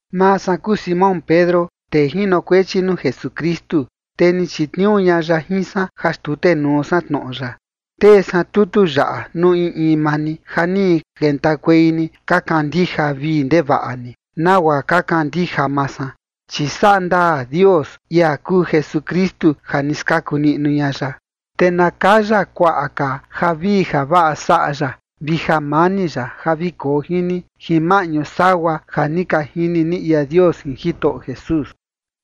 Maa san kuu Simón Pedro tee jinokuechi nuu Jesukristu, te ni chitniuu ña ya jin san ja xtutenuu san tnoꞌo ya. Tee san tutu yaꞌa nuu in in maa ni ja ni kentakuei ni ka kandija vii ndevaꞌa ni nagua ka kandija maa san, chi saꞌa ndaa Dios, ia kuu Jesukristu, ja ni skaku niꞌnu ña ya. Te na kaya kuaꞌa ka javii javaꞌa saꞌa ya vi jamani ya ja vi koo jin ni jin maꞌñu sagua ja ni ka jini ni ia Dios jin Jitoꞌo Jesús.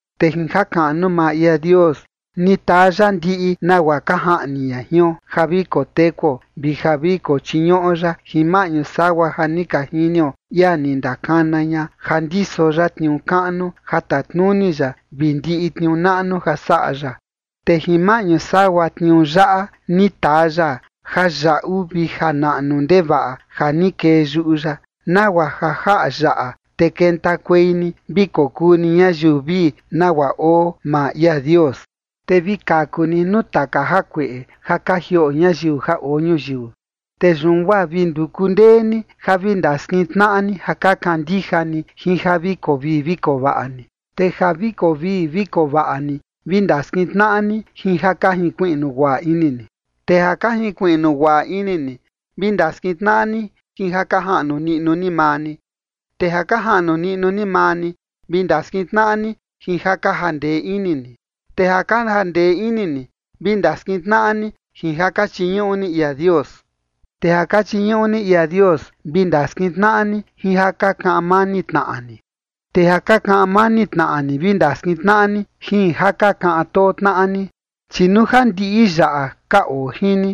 Te jin jakaꞌnu maa ia Dios, ni taa ya ndiꞌi nagua ka jaꞌni ña jion ja vi kotekuo vi ja vi kochiñuꞌo ya jin maꞌñu sagua ja ni ka jinio ia ni ndakana ña ja ndiso ya tniuu kaꞌnu ja tatnuni ya vi ndiꞌi tniuu naꞌnu ja saꞌa ya. Te jin maꞌñu sagua tniuu yaꞌa, ni taa ya jayaꞌu vi janaꞌnu ndevaꞌa ja ni kee yuꞌu ya, nagua ja jaꞌa yaꞌa, te kentakuei ni vi kokuu ni ñayiu vii, nagua oo maa ia Dios, te vi kaku ni nuu taka jakueꞌe ja ka jioꞌo ñayiu ja oo ñuyiu. Te yun guaa vi nduku ndee ni ja vi ndaskintnaꞌa ni ja ka kandija ni jin ja vi koo vii vi koo vaꞌa ni, te ja ka ovii ka ovaꞌa ni vi ndaskintnaꞌa ni jin ja ka jinkuiꞌnu guaꞌa ini ni. Te ja ka jinkuiꞌnu guaꞌa ini ni vi ndaskintnaꞌa ni jin ja ka jaꞌnu niꞌnu ni maa ni; te ja ka jaꞌnu niꞌnu ni maa ni vi ndaskintnaꞌa ni jin ja ka jandee ini ni; te ja ka jandee ini ni vi ndaskintnaꞌa ni jin ja ka chiñuꞌu ni ia Dios. Te ja ka chiñuꞌu ni ia Dios vi ndaskintnaꞌa ni jin ja ka kaꞌan mani tnaꞌa ni; te ja ka kaꞌan mani tnaꞌa ni vi ndaskintnaꞌa ni jin ja ka kaꞌan too tnaꞌa ni. Chi nuu ja ndiꞌi yaꞌa ka oo jin ni,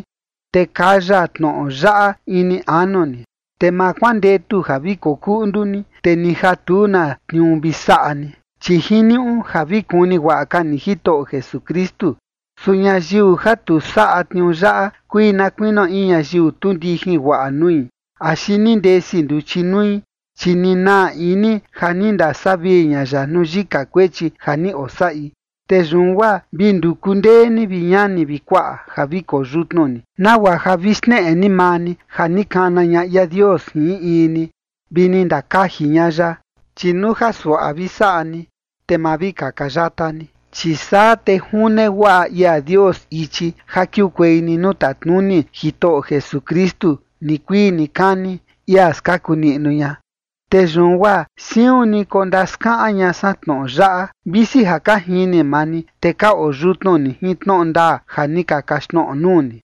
te kaya tnoꞌo yaꞌa ini anu ni, te ma kuandetu ja vi koo kuꞌndu ni, te ni ja tu na tniuu vi saꞌa ni, chi jiniuꞌu ja vi kuni guaꞌa ka ni Jitoꞌo Jesukristu. Su ñayiu ja tu saꞌa tniuu yaꞌa kui na kuinio in ñayiu tu ndijin guaꞌa nui axi ni ndesi nduchi nui, chi ni naa ini ja ni ndasavii ña ya nuu yika kuechi ja ni osaꞌi. Te yun guaa vi nduku ndee ni, vi ñani vi kuaꞌa, ja vi koyutnu ni, nagua ja vi xneꞌe ni maa ni ja ni kana ña ia Dios jin in in ni vi ni ndakaji ña ya. Chi nuu ja suaꞌa vi saꞌa ni, te ma vi kaka yata ni. Chi saa te june guaꞌa ia Dios ichi ja kiukuei ni nuu tatnuni Jitoꞌo Jesukristu nikuii nikani, ia skaku niꞌnu ña. Te yun guaa siun ni kondaskaꞌan ña san tnoꞌo yaꞌa, visi ja ka jini maa ni, te ka oyutnu ni jin tnoꞌo ndaa ja ni ka kaxtnoꞌo nuu ni.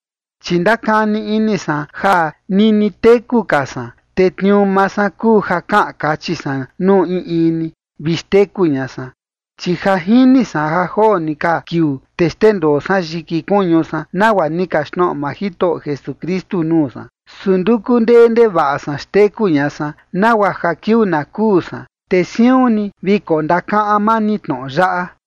Chi ndakani ini san ja nini teku ka san, te tniuu maa san kuu ja kaꞌan kachi san nuu in in ni vi xteku ña san. Chi ja jini san ja joo ni ka kiuu, te xndendoo san yiki kuñu san, nagua ni kaxtnoꞌo maa Jitoꞌo Jesukristu nuu san. Su nduku ndee ndevaꞌa san xteku ña san nagua ja kiuu na kuu san, te siun ni vi kondakaꞌan maa ni tnoꞌo yaꞌa.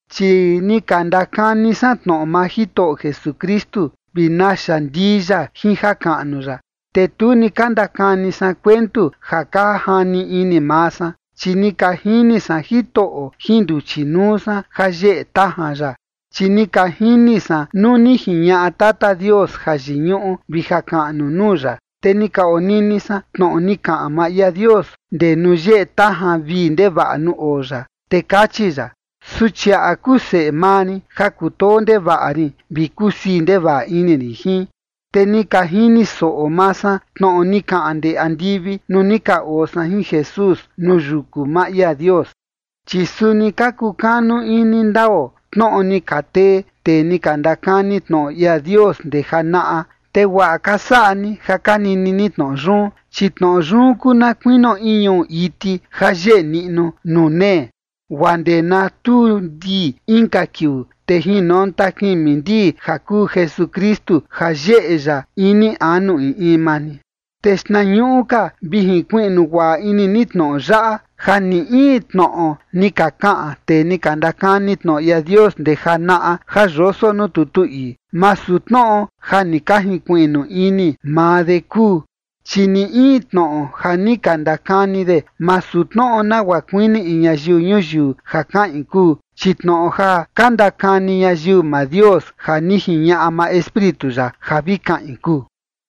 Chi ni ka ndakani san tnoꞌo maa Jitoꞌo Jesukristu vi naxa ndii ya jin jakaꞌnu ya, te tu ni ka ndakani san kuentu ja ka jani ini maa san, chi ni ka jini san Jitoꞌo jin nduchi nuu san jayeꞌe tajan ya. Chi ni ka jini san nuu ni jiñaꞌa Tata Dios jayiñuꞌu vi jakaꞌnu nuu ya, te ni ka onini san tnoꞌo ni kaꞌan maa ia Dios ndee nuu yeꞌe tajan vii ndevaꞌa nuu oo ya, te kachi ya: “Suchiaꞌa kuu seꞌe maa rin ja kutoo ndevaꞌa rin vi kusii ndevaꞌa ini rin jin”. Te ni ka jini soꞌo maa san tnoꞌo ni kaꞌan ndee andivi nuu ni ka oo san jin Jesús nuu yuku maa ia Dios. Chi suni ka kukanu ini ndao tnoꞌo ni ka tee tee ni ka ndakani tnoꞌo ia Dios ndee janaꞌa, te guaꞌa ka saꞌa ni ja ka nini ni tnoꞌo yun, chi tnoꞌo yun kuu na kuinio in ñuꞌu iti ja yeꞌe niꞌnu nuu nee, guaa ndee na tuu ndii inka kiuu, te jinonta kimi ndii ja kuu Jesukristu ja yeꞌe ya ini anu in in maa ni. Te xtnañuꞌu ka vi jinkuiꞌnu guaꞌa ini ni tnoꞌo yaꞌa, ja ni in tnoꞌo ni ka kaꞌan tee ni ka ndakani tnoꞌo ia Dios ndee janaꞌa ja yoso nuu tutu ii, masu tnoꞌo ja ni ka jinkuiꞌnu ini maa de kuu. Chi ni in tnoꞌo ja ni ka ndakani de, masu tnoꞌo nagua kuini in ñayiu ñuyiu ja kaꞌin kuu, chi tnoꞌo ja ka ndakani ñayiu maa Dios ja ni jiñaꞌa maa Espíritu ya ja vi kaꞌin kuu.